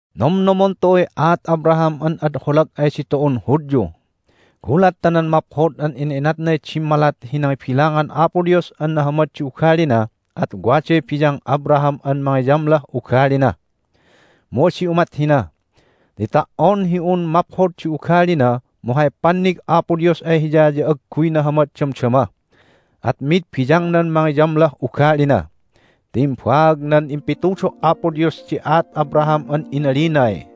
Nomnomon tu'uy aat Abraham an ad holag ay ditu'un Hudyu. Gulat ta nan maphod an ina'inatnay dimmalat hi nangibilangan Apo Dios an nahamad di ugalina at waday biyang Abraham an mangiyamlah ugalina. Mu adi umat hina, ti ta"on hi un maphod di ugalina mu hay pannig Apo Dios ay hiya ya agguy nahamad damdama, at mid biyangnan mangiyamlah ugalina. Ti imbaag nan impitudo' Apo Dios di aat Abraham an inalinay,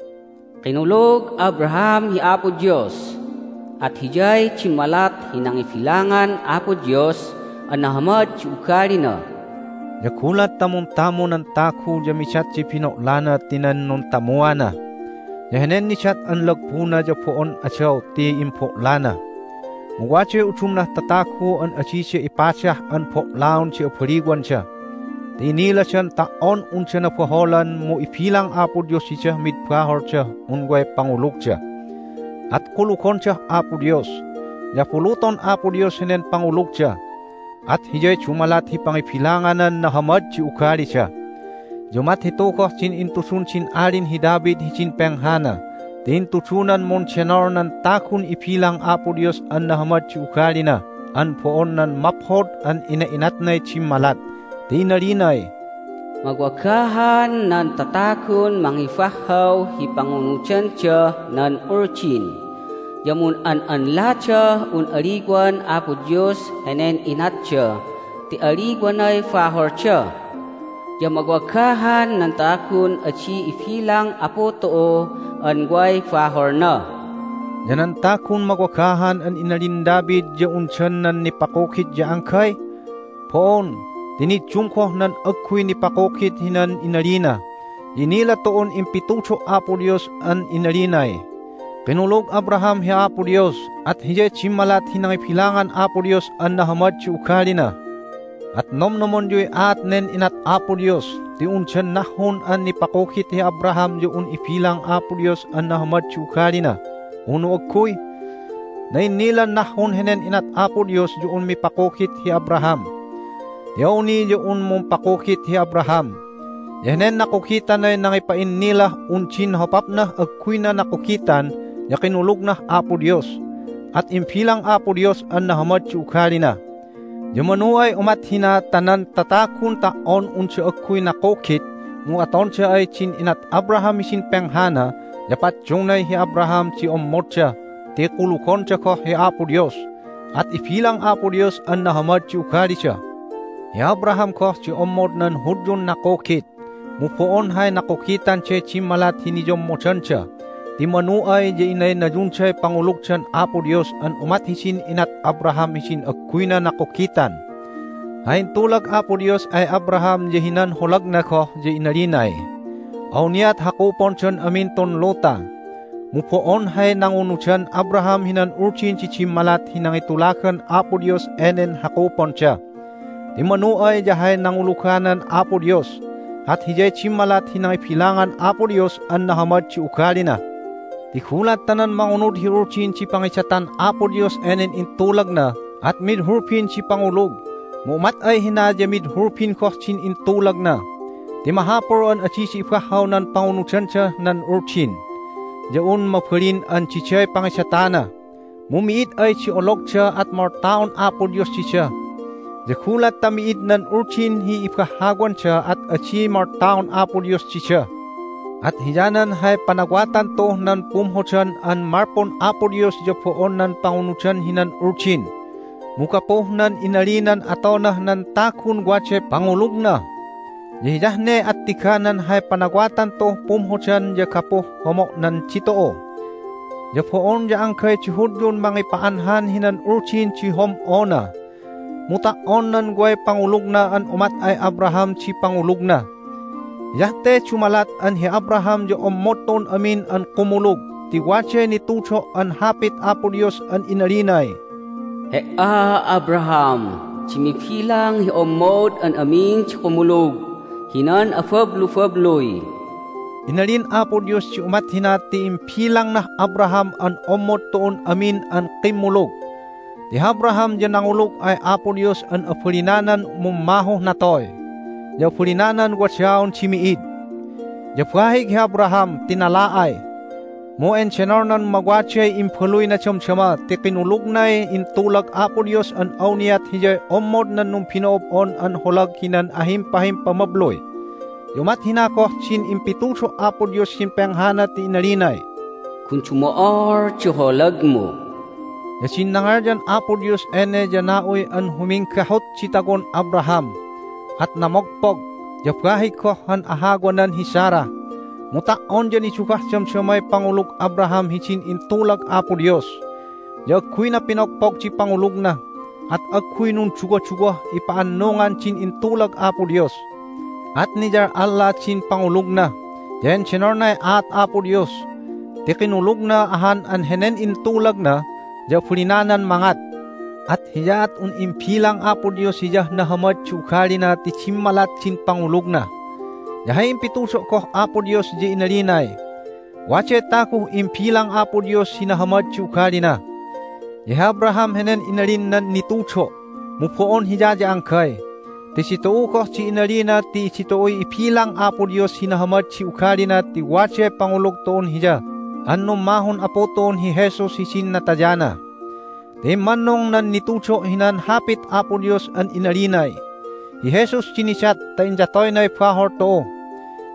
"Kinulug Abraham hi Apo Dios, at hiyay dimmalat hi nangibilangan Apo Dios an nahamad di ugalina." Ya gulat ta muntamu nan tagu ya midat di bino'lana ti nan nuntamuana. Ya henen nidat an lagbuna ya bo'on adaw ti imbo'lana. Mu waday udumnah tatagu an adida ipadah an bo'laon di abaliwanda, ti iniladan ta"on unda nabaholan mu ibilang Apo Dios didah mid baholdah un way pangulugda, at kulugondah Apo Dios. Ya abuluton Apo Dios henen pangulugda, at hiyay dumalat hi pangibilanganan nahamad di ugalida. Ya umat hitu goh din intudun din Alin hi David hidin penghana ti intudunan mundenol nan tagun ibilang Apo Dios an nahamad di ugalina an bo'on nan maphod an ina'inatnay dimmalat, ti inalinay, "Mawagahan nan tatagun mangibahhaw hi pangunudandah nan Uldin, ya mun'an'anladah un aliwan Apo Dios henen inatda ti aliwanay baholda! Ya mawagahan nan tagun adi ibilang Apu tu'u an way baholna!" Ya nan tagun mawagahan an inalin David ya undan nan nipakugit ya anggay? Bo'on, ti niddum goh nan agguy nipakugit hinan inalina. Ya inila tu'un impitudo' Apo Dios an inalinay, "Kinulug Abraham hi Apo Dios, at hiyay dimmalat hi nangibilangan Apo Dios an nahamad di ugalina." At nomnomonyuy aat nen inat Apo Dios, ti undan nahhun an nipakugit hi Abraham ya un ibilang Apo Dios an nahamad di ugalina, unu agguy? Na'innilan nahhun henen inat Apo Dios ya un mipakugit hi Abraham! Ti awni ya un mumpakugit hi Abraham! Ya henen nakugitanay nangipa'innilah un din hopapnah agguyna nakugitan ya kinulugnah Apo Dios, at imbilang Apo Dios an nahamad di ugalina. Ya manu ay umat hina ta nan tatagun ta"on unda agguy nakugit, mu atonda ay din inat Abraham hidin penghana ya paddungnay hi Abraham di ommodda ti kulugonda goh hi Apo Dios, at ibilang Apo Dios an nahamad di ugalida. Hi Abraham goh di ommod nan Hudyun nakugit, mu bo'on hay nakugitanday dimmalat hi niyommodanda, ti manu ay ya inaynayunday pangulugdan Apo Dios an umat hidin inat Abraham hidin agguyna nakugitan. Hay intulag Apo Dios ay Abraham ya hinan holagna goh ya inalinay, "Awniat hakupondan amin tun luta." Mu bo'on hay nangunudan Abraham hinan Uldin di dimmalat hi nangitulagan Apo Dios enen hakuponda. Ti manu ay ya hay nanguluganan Apo Dios, at hiyay dimmalat hi nangibilangan Apo Dios an nahamad di ugalina. Ti gulat ta nan mangunud hi Uldin di pangidatan Apo Dios enen intulagna at mid hulbin di pangulug. Mu umat ay hina ya mid hulbin goh din intulagna. Ti mahapul an adida ibahhaw nan pangunudandah nan Uldin ya un mabalin an diday pangidatana, mu mi'id ay di ologda at moltaon Apo Dios dida. Ya gulat ta mi'id nan Uldin hi ibahhawanda at adi moltaon Apo Dios dida. At hiyanan hay panawatan tu'uh nan pumhodan an malpun Apo Dios ya bo'on nan pangunudan hinan Uldin, mu gapuh nan inalinan atonah nan tagun waday pangulugna. Ya hiyah ne attiganan hay panawatan tu'uh pumhodan ya gapuh homo'nan ditu'u. Ya bo'on ya anggay di Hudyun mangipa'anhan hinan Uldin di hom'ona, mu ta"on nan way pangulugna an umat ay Abraham di pangulugna. Hiyah te dumalat an hi Abraham ya ommod tu'un amin an kumulug ti waday nitudo' an Hapit Apo Dios an inalinay, "He"a, Abraham, di mibilang hi ommod an amin di kumulug hinan abablubabluy." Inalin Apo Dios di umat hina ti imbilangnah Abraham an ommod tu'un amin an kimmulug. Ti hi Abraham ya nangulug ay Apo Dios an abalinanan mummahuh natoy, ya abalinanan wadaon di mi'id. Ya bahig hi Abraham ti nala'ay, mu endenolnan mawaday imbaluyna damdama ti kinulugnay intulag Apo Dios an awniat hiyay ommod nan numbino'ob'on an holag hinan ahimpahimpamabluy. Ya umat hina goh din impitudo' Apo Dios hidin penghana ti inalinay, "Gun dumo'ol di holagmu." Ya din nangalyan Apo Dios ene ya na'uy an huminggahut di tawon Abraham, at namogpog. Ya bahig goh han ahawanan hi Sarah. Mu ta"on ya nidugah damdamay pangulug Abraham hidin intulag Apo Dios. Ya agguyna pinogpog di pangulugna, at agguy nunduwaduwah ipa'annungan din intulag Apo Dios. At niyal'alla din pangulugna, ya endenolnay aat Apo Dios ti kinulugna ahan an henen intulagna ya abalinanan mangat. At hiyaat un imbilang Apo Dios hiyah nahamad di ugalina ti dimmalat din pangulugna. Ya hay impitudo' goh Apo Dios ya inalinay, "Waday taguh imbilang Apo Dios hi nahamad di ugalina." Ya hi Abraham henen inalin nan nitudo'. Mu bo'on hiya ya anggay ti ditu'u goh di inalina ti ditu'uy ibilang Apo Dios hi nahamad di ugalina ti waday pangulug tu'un Hiya an nummahun Apu tu'un hi Jesus hidin natayana. Ti immannung nan nitudo' hinan Hapit Apo Dios an inalinay, "Hi Jesus di nidat ta inyatoynay bahol tu'u,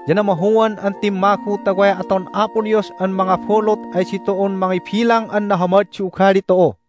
ya namahuan an timmagu ta way aton Apo Dios an mangabulut ay ditu'un mangibilang an nahamad di ugali tu'u."